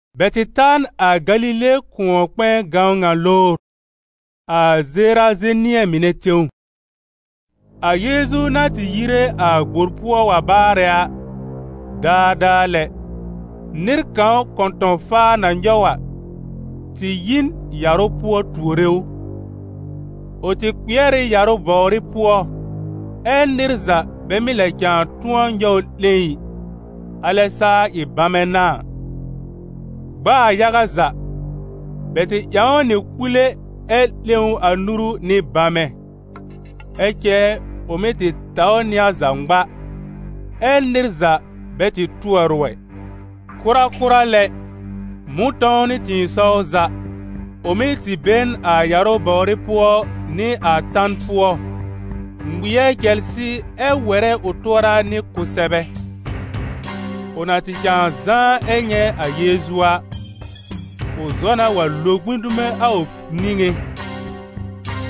Bɛ tɩ ta n a Galile kʋ̃ɔ-kpɛ̃ɛ gãwn ŋa lowr, a Zerazenɩ̃ɛ mɩnɛ tẽw. A Yeezu na tɩ yire a gbor pʋɔ wa baarɛ a, daadaa lɛ, nɩr kãw kɔ̃tɔ̃-faa na nyɔw a, tɩ yi n yarʋ pʋɔ tuore ʋ. Ʋ tɩ kpɩɛr ɩ yarʋ bɔwrɩ pʋɔ ɛ nɩr za bɛ mɩ́ lɛ cãa tʋ̃ɔ nyɔw ʋ 'lẽ ɩ, alɛ saa ɩ bamɛ n'a a. Gb'aa yaga za, bɛ tɩ ƴãw ʋ nɩ kpule ɛ 'lẽ a ʋ nuru nɩ bamɛ, ɛ cɛ ʋ mɩ́ tɩ taw nɩ a za ŋma, ɛ nɩr za bɛ tɩ tʋɔr ʋ ɛ. Kʋrakʋra lɛ, mʋ̃tɔ̃w nɩ tɩ̃ɩsɔw za, ʋ mɩ́ tɩ be n a yarʋ bɔwrɩ pʋɔ nɩ a tan pʋɔ, ŋmɩɛr cɛlsɩ ɛ wɛrɛ ʋ tʋɔra nɩ kʋsɛbɛ. Ʋ na tɩ cãa zãá ɛ nyɛ̃ a Yeezu a, ʋ zɔ na wa lo gbĩ dume a ʋ niŋé.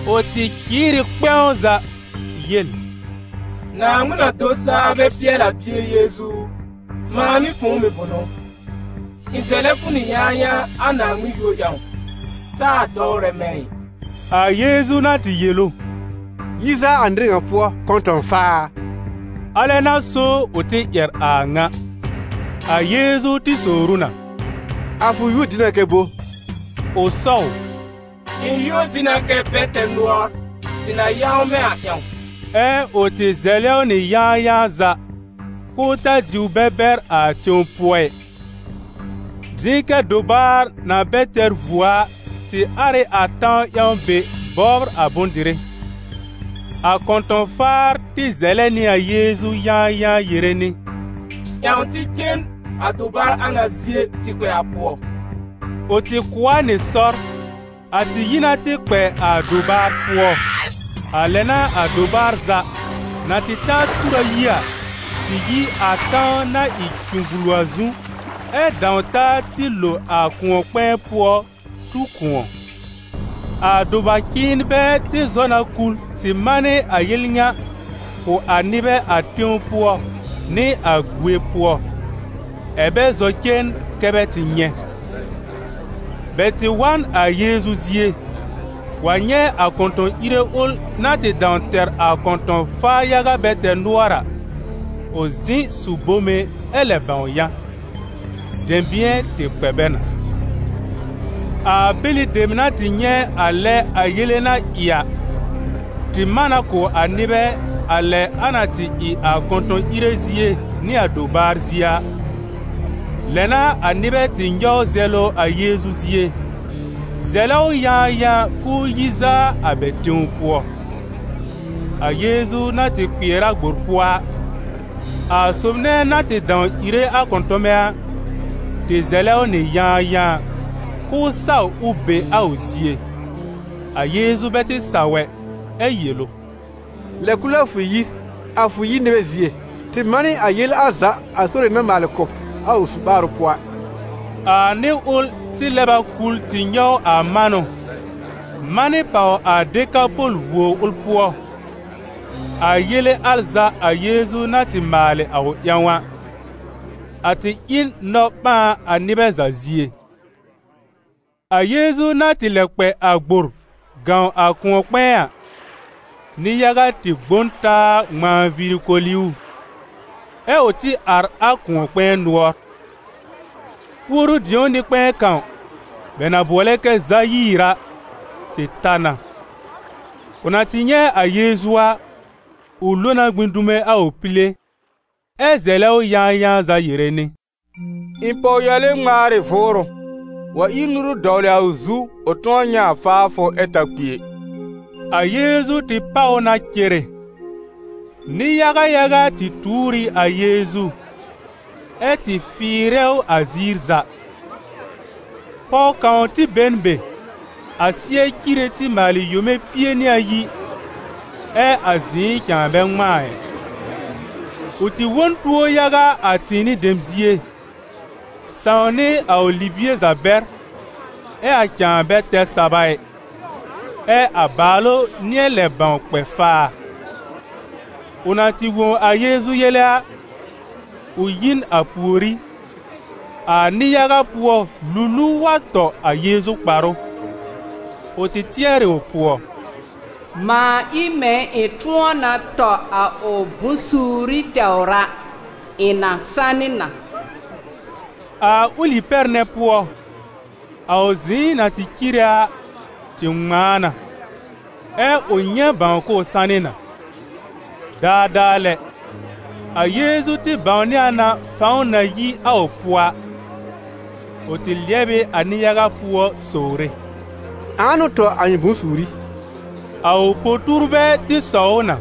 Ʋ tɩ cɩɩr ɩ kpɛ̃w za yel: «Naaŋmɩn na-do-saa-bɛ-pɩɛl-a Bie Yeezu u, mãa nɩ fʋ̃ʋ mɩ̀ bʋnʋ? Ɩ̃ zɛlɛ fʋ nɩ yãayãa, a Naaŋmɩn yúor ƴãw, taa dɔwrɛ mɛ̃ ɩ.» A Yeezu na tɩ yel ʋ: «Yi zaa a nɩr ŋa pʋɔ, kɔ̃tɔ̃-faa a!», alɛ n'a so ʋ tɩ ƴɛr a a ŋa. A Yeezu tɩ sowr ʋ na: «A fʋ yúor dɩ na kɛ bo?» Ʋ sɔw: «Ɩ̃ yúor dɩ na kɛ: ‹Bɛ-tɛr-nʋɔr›, tɩ na yãwmɛ̃ a ƴãw.» Ɛ ʋ tɩ zɛlɛ ʋ nɩ yãayãa za, k'ʋʋ ta diw bɛ bɛr a tẽw pʋɔ ɩ. Zɩ̃ kɛ dobaar na bɛ tɛr vuo a tɩ ar ɩ a tãw ƴãw be bɔbr a bʋ̃-dɩrɩ. A kɔ̃tɔ̃-faar tɩ zɛlɛ nɩ a Yeezu yãayãa yere nɩ: «Ƴãw tɩ cen a dobaar a ŋa zie tɩ kpɛ a pʋɔ.» Ʋ tɩ kʋ̀ a nɩ sɔr. A tɩ yi na tɩ kpɛ a dobaar pʋɔ. A lɛ n'a a dobaar za, na tɩ ta tur ayi a, tɩ yi a tãw na ɩ cũgbulu a zu, ɛ dãw taa tɩ lo a kʋ̃ɔ-kpɛ̃ɛ pʋɔ tu kʋ̃ɔ. A doba-cɩ̃ɩnbɛ tɩ zɔ na kul tɩ manɩ a yel ŋa kʋ̀ a nɩbɛ a tẽw pʋɔ nɩ a gue pʋɔ, ɛ̀ bɛ zɔ cen kɛ bɛ tɩ nyɛ̃. Bɛ tɩ wa n a Yeezu zie, wa nyɛ̃ a kɔ̃tɔ̃-ìre ʋl na tɩ dãw tɛr a kɔ̃tɔ̃-faar yaga bɛ tɛr nʋɔr a, ʋ zɩ̃ su bome ɛ lɛ bãw yã. Dɛ̃bɩ̃ɛ tɩ kpɛ bɛ na. A bɛlɩ dem na tɩ nyɛ̃ a lɛ a yele na ɩ a, tɩ man na kʋ̀ a nɩbɛ a lɛ a na tɩ ɩ a kɔ̃tɔ̃-ìre zie nɩ a dobaar zie a. Lɛ n'a a nɩbɛ tɩ nyɔw zɛlʋ a Yeezu zie, zɛlɛ ʋ yãayãa k'ʋʋ yi zaa a bɛ tẽw pʋɔ. A Yeezu na tɩ kpɩɛr a gbor pʋɔ a, a sob nɛ na tɩ dãw ìre a kɔ̃tɔmɛ a, tɩ zɛlɛ ʋ nɩ yãayãa, k'ʋʋ saw ʋ be a ʋ zie. A Yeezu bɛ tɩ saw ɛ, ɛ yel ʋ: «Lɛb kul a fʋ yir, a fʋ yir nɩbɛ zie, tɩ manɩ a yele al za a Sore na maalɩ kʋ̀ b a ʋ su-ɓaarʋ pʋɔ a.» A nɩr ʋl tɩ lɛb a kul tɩ nyɔw a manʋ, manɩ pàw a Dekapɔl vuo ʋl pʋɔ, a yele al za a Yeezu na tɩ maalɩ a ʋ ƴãw a. A tɩ ɩ n nɔ-ɓãan a nɩbɛ za zie. A Yeezu na tɩ lɛb kpɛ a gbor gãw a kʋ̃ɔ-kpɛ̃ɛ a, nɩ-yaga tɩ gbõ n taa ŋmãa viiri koli ʋ, ɛ ʋ tɩ ar a kʋ̃ɔ-kpɛ̃ɛ nʋɔr. Puoru-dĩo nɩ-kpɛ̃ɛ kãw, bɛ na bʋɔlɛ kɛ Zayiir a, tɩ ta na. Ʋ na tɩ nyɛ̃ a Yeezu a, ʋ lo na gbĩ dume a ʋ pile, ɛ zɛlɛ ʋ yãayãa za yere nɩ: «Ɩ̃ pɔwyale ŋmaar ɩ vʋʋrʋ, wa ír nuru dɔwlɩ a ʋ zu, ʋ tʋ̃ɔ nyɛ̃ a faafʋ ɛ ta kpi ɛ.» A Yeezu tɩ páw ʋ na cere; nɩ-yaga yaga tɩ tuur ɩ a Yeezu, ɛ́ tɩ fɩɩrɛ ʋ a ziir za. Pɔw kãw tɩ be n be, a sɩɛ cire tɩ maalɩ yome pie nɩ ayi, ɛ a zɩ̃ɩ cãa bɛ ŋmãa ɩ. Ʋ tɩ wõ n tuo yaga a tɩ̃ɩnɩ dem zie, sãw nɩ a ʋ libie za bɛr ɛ a cãa bɛ tɛr saba ɩ, ɛ a bàalʋ nɩ̃ɛ lɛ bãw kpɛ faa. Ʋ na tɩ wõ a Yeezu yele a, ʋ yi n a pùorí, a nɩ-yaga pʋɔ luluw wa tɔ a Yeezu kparʋ. Ʋ tɩ tɩɛr ɩ ʋ pʋɔ: «Mãa ɩ mɛ̃ ɩ̃ tʋ̃ɔ na tɔ a ʋ bʋ̃-suuri tɛwr a, ɩ̃ na sanɩ na.» A ʋlɩ pɛr nɛ pʋɔ, a ʋ zɩ̃ɩ na tɩ cire a tɩ ŋmãa na, ɛ ʋ nyɛ̃ bãw k'ʋʋ sanɩ na. Daadaa lɛ, a Yeezu tɩ bãwnɩ a na fãw na yi a ʋ pʋɔ a. Ʋ tɩ lɩɛb ɩ a nɩ-yaga pʋɔ sowre: «Ãa n'ʋ tɔ a ɩ̃ bʋ̃-suuri?» A ʋ po-tuurbɛ tɩ sɔw ʋ na: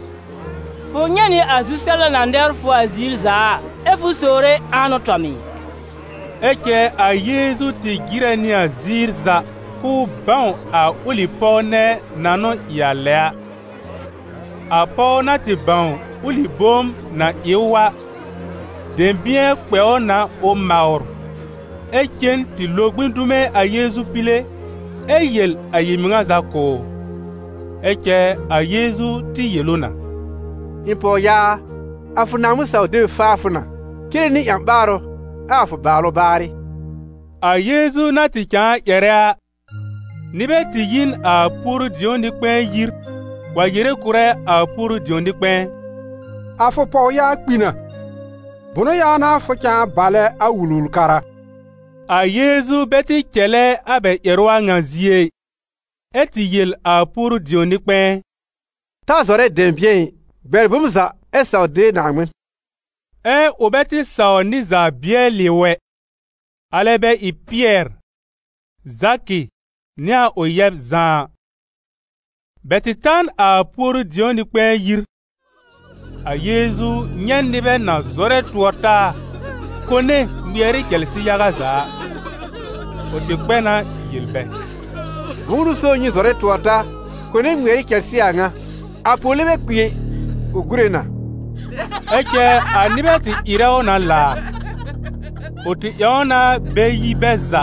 «Fʋ nyɛ̃ nɩ a zu-sɛbla na nɛbr fʋ a ziir za a, ɛ fʋ sowre: ‹Ãa n'ʋ tɔ m ɩ?›» Ɛ cɛ a Yeezu tɩ jɩrɛ nɩ a ziir za k'ʋʋ bãw a ʋlɩ pɔw nɛ na n'ʋ ɩ a lɛ a. A pɔw na tɩ bãw ʋlɩ bom na ɩ ʋ a, dɛ̃bɩ̃ɛ kpɛ ʋ na ʋ mawr, ɛ cen tɩ lo gbĩ dume a Yeezu pile ɛ yel a yel-mɩŋa za kʋ̀ ʋ. Ɛ cɛ a Yeezu tɩ yel ʋ na: «Ɩ̃ pɔwyaa a, a fʋ Naaŋmɩn-saw-deb faa fʋ na: cere nɩ ƴã-ɓaarʋ ɛ a fʋ bàalʋ baarɩ.» A Yeezu na tɩ cãa ƴɛrɛ a, nɩbɛ tɩ yi n a puoru-dĩo nɩ-kpɛ̃ɛ yir wa yere kʋ̀rɛ a puoru-dĩo nɩ-kpɛ̃ɛ: «A fʋ pɔwyaa kpi na, bʋnʋ ƴãw n'a fʋ cãa balɛ a Wul-wul-kara?» A Yeezu bɛ tɩ cɛlɛ a bɛ ƴɛrʋ a ŋa zie ɩ, ɛ tɩ yel a puoru-dĩo nɩ-kpɛ̃ɛ: «Ta zɔrɛ dɛ̃bɩ̃ɛ ɩ, bɛr bom za ɛ saw de Naaŋmɩn.» Ɛ ʋ bɛ tɩ saw nɩr za bɩɛlɩ ʋ ɛ, alɛ bɛ ɩ Pɩɛr, Zakɩ nɩ a ʋ yɛb Zã a. Bɛ tɩ ta n a puoru-dĩo nɩ-kpɛ̃ɛ yir. A Yeezu nyɛ̃ nɩbɛ na zɔrɛ tʋɔr-taa, kone ŋmɩɛr ɩ cɛlsɩ yaga za a. Ʋ tɩ kpɛ na yel bɛ: «Bʋ̃ʋ n'ʋ so nyɩ zɔrɛ tʋɔr taa kone ŋmɩɛr ɩ cɛlsɩ a ŋa? A pɔwle bɛ kpi ɛ, ʋ gúre na!» Ɛ cɛ a nɩbɛ tɩ ɩrɛ ʋ na laar. Ʋ tɩ ƴãw na bɛ yi bɛ za,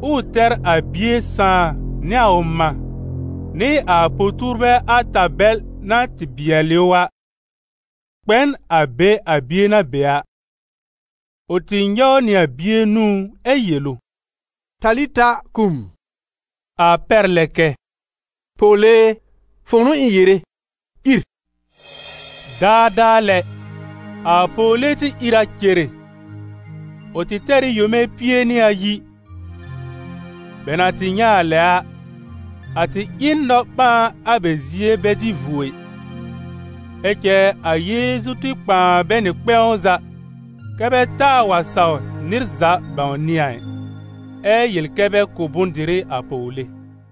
ʋʋ tɛr a bie sãà nɩ a ʋ mã nɩ a po-tuurbɛ ata bɛl na tɩ bɩɛl ʋ a, kpɛ n a be a bie na be a. Ʋ tɩ nyɔw nɩ a bie nũú ɛ yel ʋ: «Talita kum», a pɛr lɛ kɛ: «Pɔwle e, fʋ̃ʋ n'ʋ ɩ̃ yere, ìr.» Daadaa lɛ, a pɔwle tɩ ìr a cere. Ʋ tɩ tɛr ɩ yome pie nɩ ayi. Bɛ na tɩ nyɛ̃ a lɛ a, a tɩ ɩ n nɔ-ɓãan a bɛ zie bɛ dɩ vuo ɩ. Ɛ cɛ a Yeezu tɩ kpãa bɛ nɩ kpɛ̃w za, kɛ́ bɛ taa wa saw nɩr za bãwnɩ a ɩ. Ɛ yel kɛ bɛ kʋ̀ bʋ̃-dɩrɩ a pɔwle.